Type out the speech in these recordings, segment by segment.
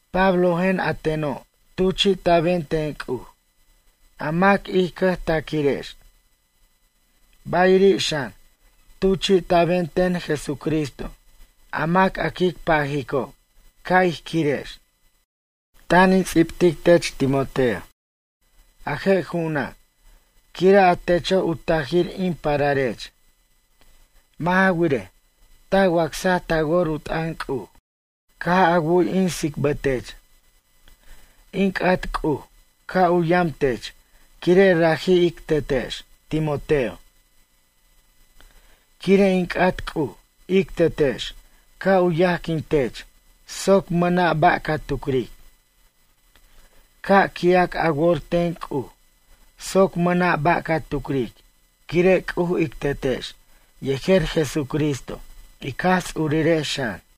Pablojen a teno' tuchi'ta'ben ten C'uj, a mac ij cʌjtaquirex. Bayiri' xan tuchi'ta'ben ten Jesucristo a mac a quic pajico' ca' ij quirej. Tan in ts'ibtic tech Timoteo, a je' ju'una' quire' a techo' u tajir in pararech. Mʌ' ja wirej, ta wacsaj ta wor u t'ʌn C'uj caj a wu'y in tsicbʌtech. In c'at C'uj ca' u yam tech quire' raji' ic Tetex, Timoteo. Quire' in c'at C'uj, ic Tetex, ca' u yajquintech soc mʌna' ba' ca tucric. Ca' qui'ac a wor ten C'uj soc mʌna' ba' ca tucric quire' C'uj ic Tetex, yejer Jesucristo ic Jaj Ts'urirex xan.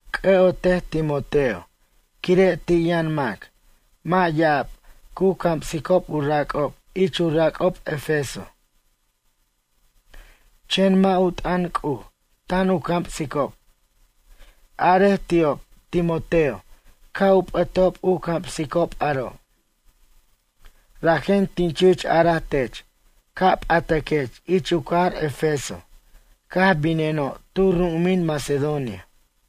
C'ʌ'otej Timoteo quire' ti' yʌn mac, mʌ' ya'ab, cu camsicob u rac'ob ich u rac'ob Efeso. Chen mʌ' u t'ʌn C'uj tan u camsicob. Arej ti'ob, Timoteo ca' u p'ʌtob u camsicob aro'. Rajen tin chich araj tech ca' p'ataquech ich u cajar Efeso caj bineno' tu ru'umin Macedonia.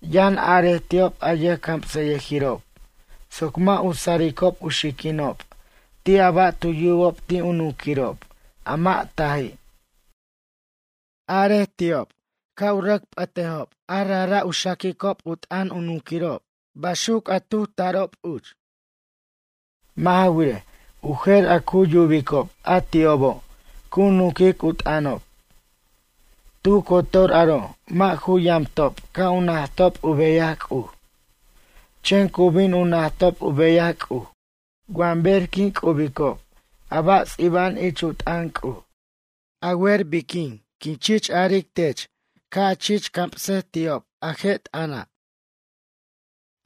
Yʌn arej ti'ob a yʌjcamsʌyʌjirob soc mʌ' u saricob u xiquinob ti' a ba' tu yubob ti' u nunquirob a mʌ' taji'. Arej ti'ob ca' u rʌc p'ʌticob a rajra' u xaquicob u t'ʌn u nunquirob baxuc a tu ju tarob uch. Mʌ' ja wirej, u jer a cu yubicob a ti'obo' cu nunquic u t'ʌnob. Tu cotor aro' mʌ' ju yamtob ca' u najtob u beyaj C'uj. Chen cu bin u najtob u beyaj C'uj wa ber q'uin cu quibicob a ba' ts'iba'an ich u t'ʌn C'uj. A wer biquin quin chich aric tech ca' a chich camsej ti'ob a je' t'ʌna'?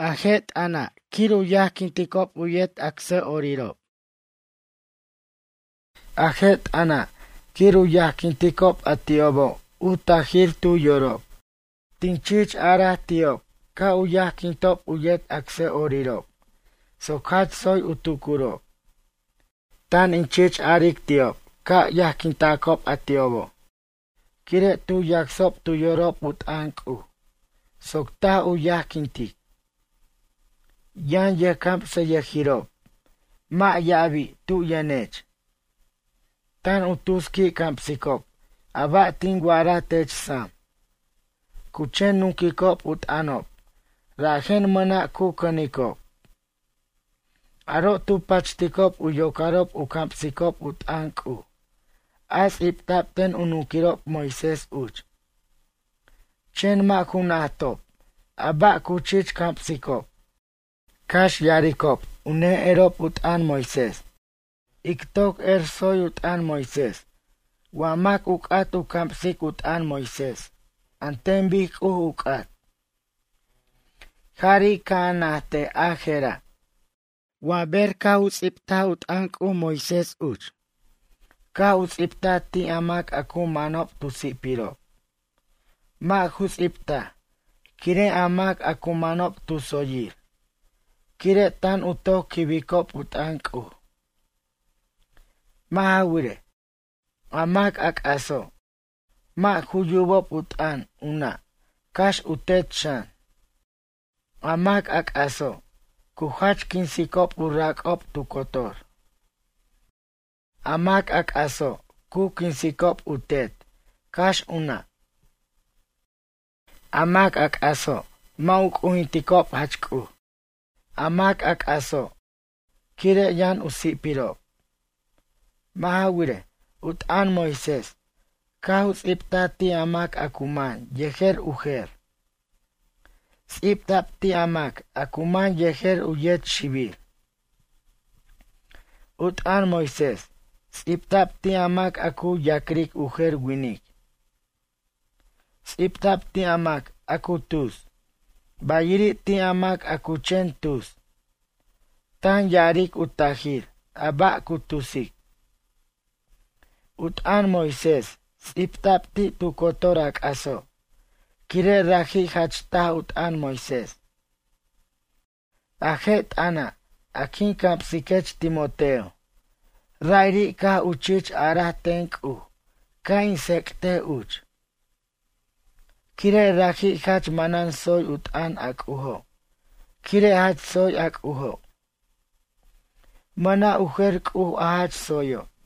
A je' t'ʌna' quir u yajquinticob u yet acsʌ'orirob jerer. A je' t'ʌna' quir u yajquinticob a ti'obo' u tajir tu yorob. Tin chich arej ti'ob ca' u yajquintob u yet acsʌ'orirob soc jach tsoy u tucurob. Tan in chich aric ti'ob ca' yajquintacob a ti'obo' quire' tu yacsob tu yorob u t'ʌn C'uj soc taj u yajquintic. Yʌn yʌjcamsayʌjirob, mʌ' ya'abi' tu yʌnech. Tan u tus qui' camsicob a ba' tin wa'ara tech sam. Cu chen nunquicob u t'ʌnob rajen mʌna' cu cʌnicob. Aro' tu pachticob u yocarob u camsicob u t'ʌn C'uj a ts'ibta'b ten u nunquirob Moisés uch. Chen mʌ' ju najtob a ba' cu chich camsicob, cax ya'aricob u ne'erob u t'ʌn Moisés. Ic toc er tsoy u t'ʌn Moisés wa mac u c'at u camsic u t'ʌn Moisés an ten bic C'uj u c'at. Jari' ca' a najtej a je'ra'. Wa ber caj ts'ibta u t'ʌn C'uj Moisés uch caj u ts'ibtaj ti' a mac a cu manob tu si'pirob. Mʌ' ju ts'ibtaj quire' a mac a cu manob tu tsoyir, quire' tan u toc quibicob u t'ʌn C'uj. Mʌ' ja wirej, a mac c'aso' mʌ' ju yubob u t'ʌn u nʌ' cax u tet xan. A mac c'aso', cu jach quinsicob u rac'ob tu cotor. A mac a c'aso' cu quinsicob u tet cax u nʌ'. A mac c'aso' mʌ' u c'ujintob jach C'uj. A mac c'aso' quire' yʌn u si'pirob. Mʌ' ja wirej, u t'ʌn Moisés caj ts'ibta'b ti' a mac a cu man yejer u jer. Ts'ibta'b ti' a mac a cu man yejer u yet xibir. U t'ʌn Moisés ts'ibta'b ti' a mac a cu ya'cric u jer winic. Ts'ibta'b ti' a mac a cu tus, bayiri' ti' a mac a cu chen tus, tan ya'aric u tajir a ba' cu tusic. U t'ʌn Moisés ts'ibta'b ti' tu cotor a c'aso' quire' raji' jach taj u t'ʌn Moisés. A je' t'ʌna' a quin camsiquech Timoteo, ra'iri' caj u chich araj ten C'uj ca' in tsec'tej uch. Quire' raji' jach manan tsoy u t'ʌn a C'ujo' quire' jach tsoy a C'ujo'. Mʌna' u jer C'uj a jach tsoyo'.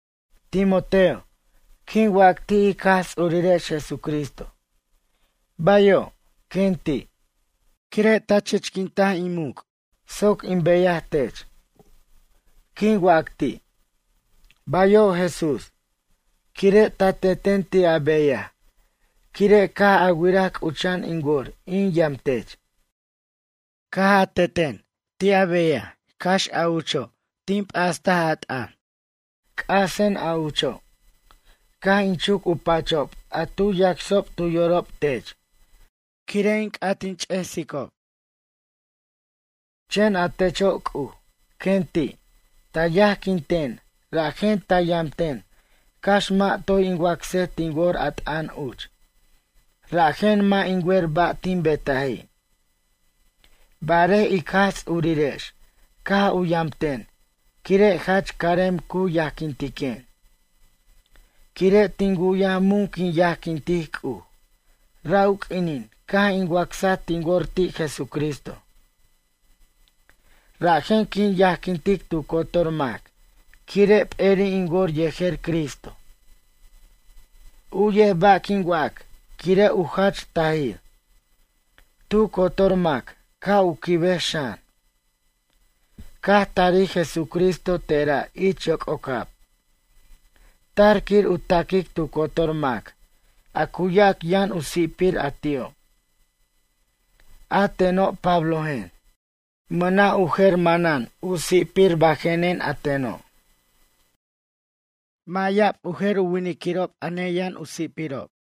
Timoteo, quin wac ti' ic Jaj Ts'urirex Jesucristo: ―Bayo', quen ti', quire' ta chichquint in muc' soc in beyaj tech. Quin wac ti': ―Bayo' Jesús, quire' ta teten ti' a beyaj quire' caj a wiraj c'ucha'an in wor in yamtech. Caj a teten ti' a beyaj cax a ucho' tin p'ast a t'ʌn. C'asen a ucho'. Caj in chuc u pachob a tu yacsob tu yorob tech quire' in c'at ch'esob. Chen a techo' C'uj, quen ti', ta yajquin ten rajen ta yamten cax mʌ' toy in wacsej tin wor a t'ʌn uch. Rajen mʌ' in wer ba' tin betaji'. Barej ic Jaj Tsurirex caj u yamten quire' jach carem cu yajquintiquen. Quire' tin wu'yaj mun quin yajquintic C'uj ra' u q'uinin caj in wacsaj tin wor ti' Jesucristo. Rajen quin yajquintic tu cotor mac quire' p'eri' in wor yejer Cristo. U'yej ba' quin wac quire' u jach tajir. Tu cotor mac ca' u quibej xan. Caj tarij Jesucristo tera' ich yoc'ocab, tar quir u taquic tu cotor mac a cu yac yʌn u si'pir a ti'o'. A teno' Pablojen. Mʌna' u jer manan u si'pir bajenen a teno'. Mʌ' ya'ab u jer winiquirob a neyʌn u si'pirob.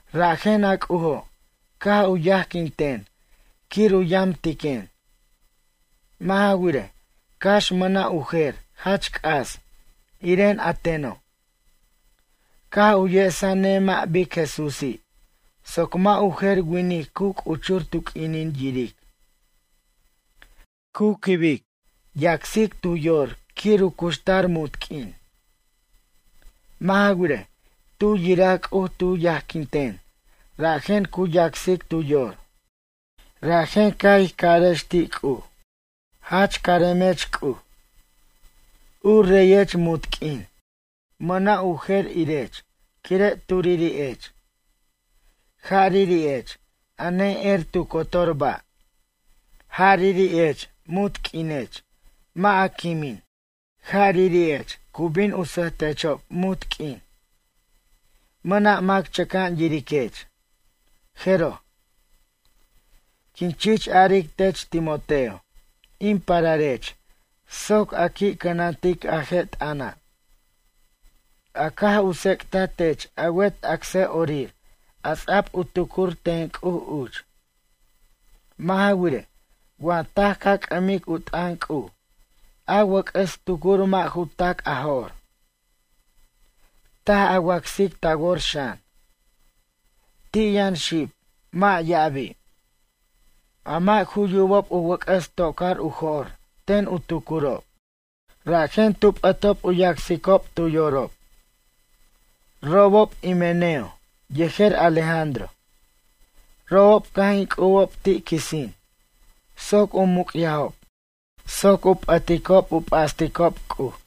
Rajen a C'ujo' caj u yajquin ten quir u yamtiquen. Mʌ' ja wirej, cax mʌna' u jer jach c'as iren a teno'. Caj u yesa nemʌ' bic Jesúsi' soc wa u jer winic cu c'uchur tu q'uinin yiric. Cu quibic, yacsic tu yor quir u cuxtar munt q'uin. Mʌ' ja wirej, tu yiraj C'uj tu yajquin ten rajen cu yacsic tu yor. Rajen ca' ij carex ti' C'uj: ―Jach caremech C'uj. U reyech munt q'uin. Mʌna' u jer irech quire' turiri'ech. Jariri'ech a ne'er tu cotor ba'. Jariri'ech munt q'uinech mʌ' a quimin. Jariri'ech cu bin sʌjtechob munt q'uin. Mʌna' mac chʌca'an yiriquech. Jeroj. Quin chich aric tech Timoteo in pararech soc a qui' cʌnantic a je' t'ʌna'. A caj u tsec'ta tech a wet acsʌ'orir a ts'a'b u tucur ten C'uj uch. Mʌ' ja wirej, wa taj ca c'ʌmic u t'ʌn C'uj a wʌc'ʌs tucur mʌ' ju tac' a jo'r. Taj a wacsic ta wor xan. Ti' yʌn xib, mʌ' ya'abi'. A mʌ' ju yubob u wʌc'ʌs to'car u jo'r ten u tucurob, rajen tu p'ʌtob u yacsicob tu yorob. Robob Himeneo yejer Alejandro. Robob caj in c'ubob ti' quisin soc u muc'yajob soc u p'ʌticob u p'asticob C'uj.